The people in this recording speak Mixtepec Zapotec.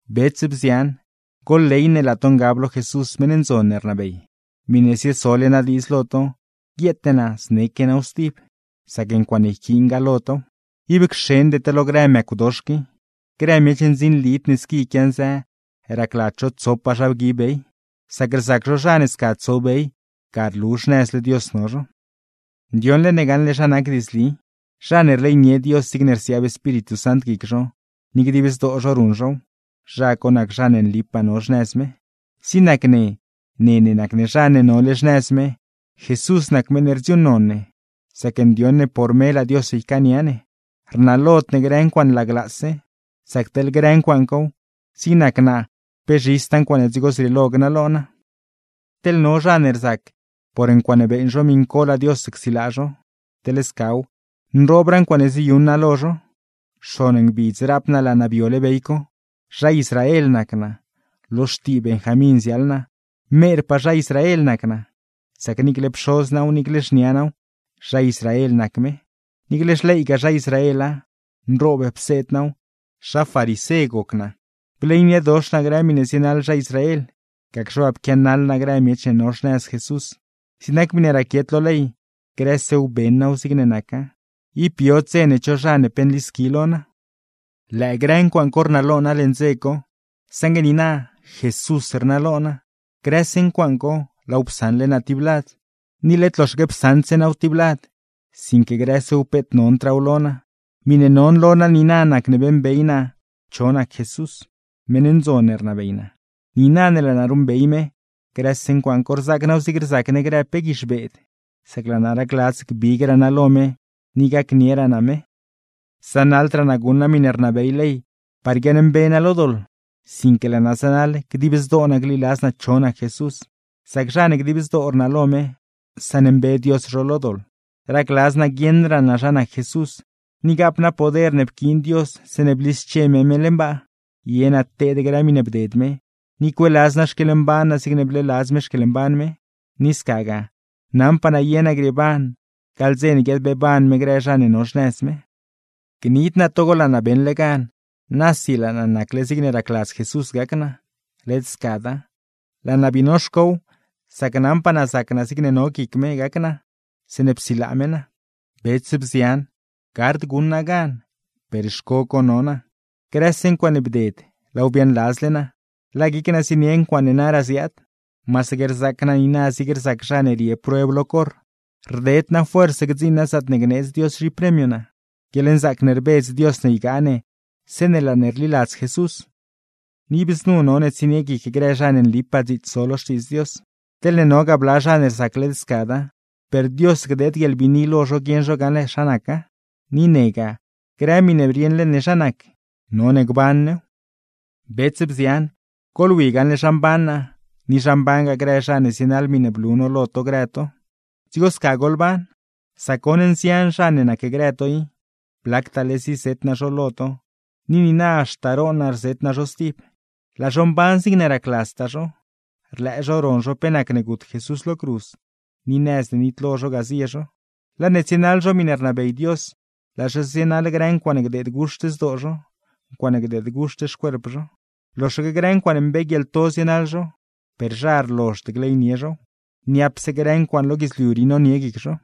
Bets, bzian, goḻley ne laa to ngab lo Jesús meṉ ndzon ne rnabey. Miṉe ziesole naa diidz lo to, guieete naa zneque naaw stib, sac ncuaaṉe yquiingaa lo tow: ¡Ib cxende to lo grë mëcw dox qui! Grë miech ndzinlid ne squi quianzë, racladz zho tsopaa zha bgui bey, sac rzac zho zha ne sca tso bey, ga rlu xnëzle Dios no zho. Saṉgue ne, ndioṉle ne zha nac diidzli, zha ne rleynie Dios zigne rsiaab Espíritu Sant guic zho, ni dib zdoo zho ruṉ zhow, zha co nac zha ne nlipaa no xnëz me. Ne ne nac ne zha ne no xnëz me, Jesús nac meṉ ne rdziuuṉnon ne, sac ndioṉ ne por me laa Dios ycaania ne; rnalod ne grë ncuaaṉe laglaase, sac teḻne scaw; zig nac naa pe zhistaa ncuaaṉe dzigo zrieelo gnalo naa. Teḻ no zha ne rzac por ncuaaṉe beeṉ zho miṉ co laa Dios csilaa zho; teḻ scaw, nroobraa ncuaaṉe ziyuṉ naa lo zho: Xon ngbidz raap naa laa naa biole bey co, zha Israel nac naa, lo xtii Benjamín ziaḻ naa, merpaa zha Israel nac naa; sac niicle pxoz naaw, niicle xniaa naaw zha Israel nac me. Niicle xleygaa zha Israela, nroob pseed naaw, zha farisé goc naa; bleyniedox naa grë miṉe zienaḻ zha Israel, gacxe waa pquianaḻ naa grë miech ne no xnëz Jesús; zig nac miṉe raquiet lo ley, grësew beṉ naaw zigne naca, ib biod dze ne cho zha pe nlisqui lo naa. Lëë grë ncuaaṉ co rnalo naa leṉ dze co, saṉgue niina Jesús rnalo naa, grëse ncuaaṉ co laaw psaṉle naa tib lad. Ni led loxaque psaṉdse naaw tiblad, sinque grësew peet nondraaw lo naa, miṉe non lo naa niina nacne beeṉbey naa cho nac Jesús, meṉ ndzon ne rnabey naa. Niina ne laa naa ruṉbey me, grëse ncuaaṉ co rzaac naaw zig rzac ne grë pe guizh beed, sac laa naa racladz gbigraa naa lo me, ni gacnieraa naa me. Zanaḻdraa naa guṉ naa miṉe rnabey ley par guiaaṉmbe naa lo doḻ, sinque laa naa zanaḻ dib zdoo naa gliladz naa cho nac Jesús; sac zha ne dib zdoo rnalo me, saṉmbe Dios zho lo doḻ. Racladz naa guieṉraa naa zha nac Jesús, ni gaap naa poder ne pquiin Dios zeeṉe blische me me leṉ baa, ye naa teed grë miṉe bded me, ni cueeladz naa xquieḻmban naa zigne bleeladz me xquieḻmban me; ni scagaa, naṉpaa naa ye naa grieeban gaḻ dze ne guiadbeeban me grë zha ne no xnëz me. Gnid naa togo laa naa beṉle gan, nasi laa naa nacle zigne racladz Jesús gac naa; led scada, laa naa bii noxcow, sac naṉpaa naa zac naa zigne no guic me gac naa zeeṉe psilaa me naa. Bets, bzian, gard guṉ naa gan; per xco co no naa; grëse ncuaaṉe bded laaw biaaṉladzle naa, laa guic naa zienie ncuaaṉe naraa ziaad. Masaque rzaac naa niina zig rzac zha ne rie prueb lo corr, rded naa fuerz gdziṉ naa zaatne gneedz Dios zhipremio naa, guieḻnzaac ne rbedz Dios ne ygaa ne zeeṉe laa ne rliladz Jesús. Ni ib znu none tsonie guic grë zha ne nlipaa dziits zo lo Xtiidz Dios; teḻne nogaa bla zha ne rzac led scada, per Dios gdeed guieḻbiini lo zho guieṉ zho gaṉle zha naca. Ni negaa, grë miṉe rieṉle ne zha nac, none gban new. Bets, bzian, goḻwi gaṉle zha mban naa, ni zha mbangaa grë zha ne zienaḻ miṉe blu no lo to grë to; dzigo sca goḻban. Sac goṉ nzian zha ne nacgrë to i (blactaale zizet naa zho lo to, ni niina haxta roon naa rzet naa zho stib), laa zho mban zigne racladztaa zho, rlëë zho ron zho pe nac gut Jesús lo cruz; ni nëz ne nitlo zho ga zie zho. Laa ne tsienaḻ zho miṉe rnabey Dios, laa zho zienaḻ grë ncuaaṉe gdeed guxt zdoo zho, ncuaaṉe gdeed guxt xcuerp zho. Loxaque grë ncuaaṉe mbee guieḻto zienaḻ zho, per zha rlozhd gleynie zhow; niapse grë ncuaaṉ lo guidzliu rii nonie guic zho.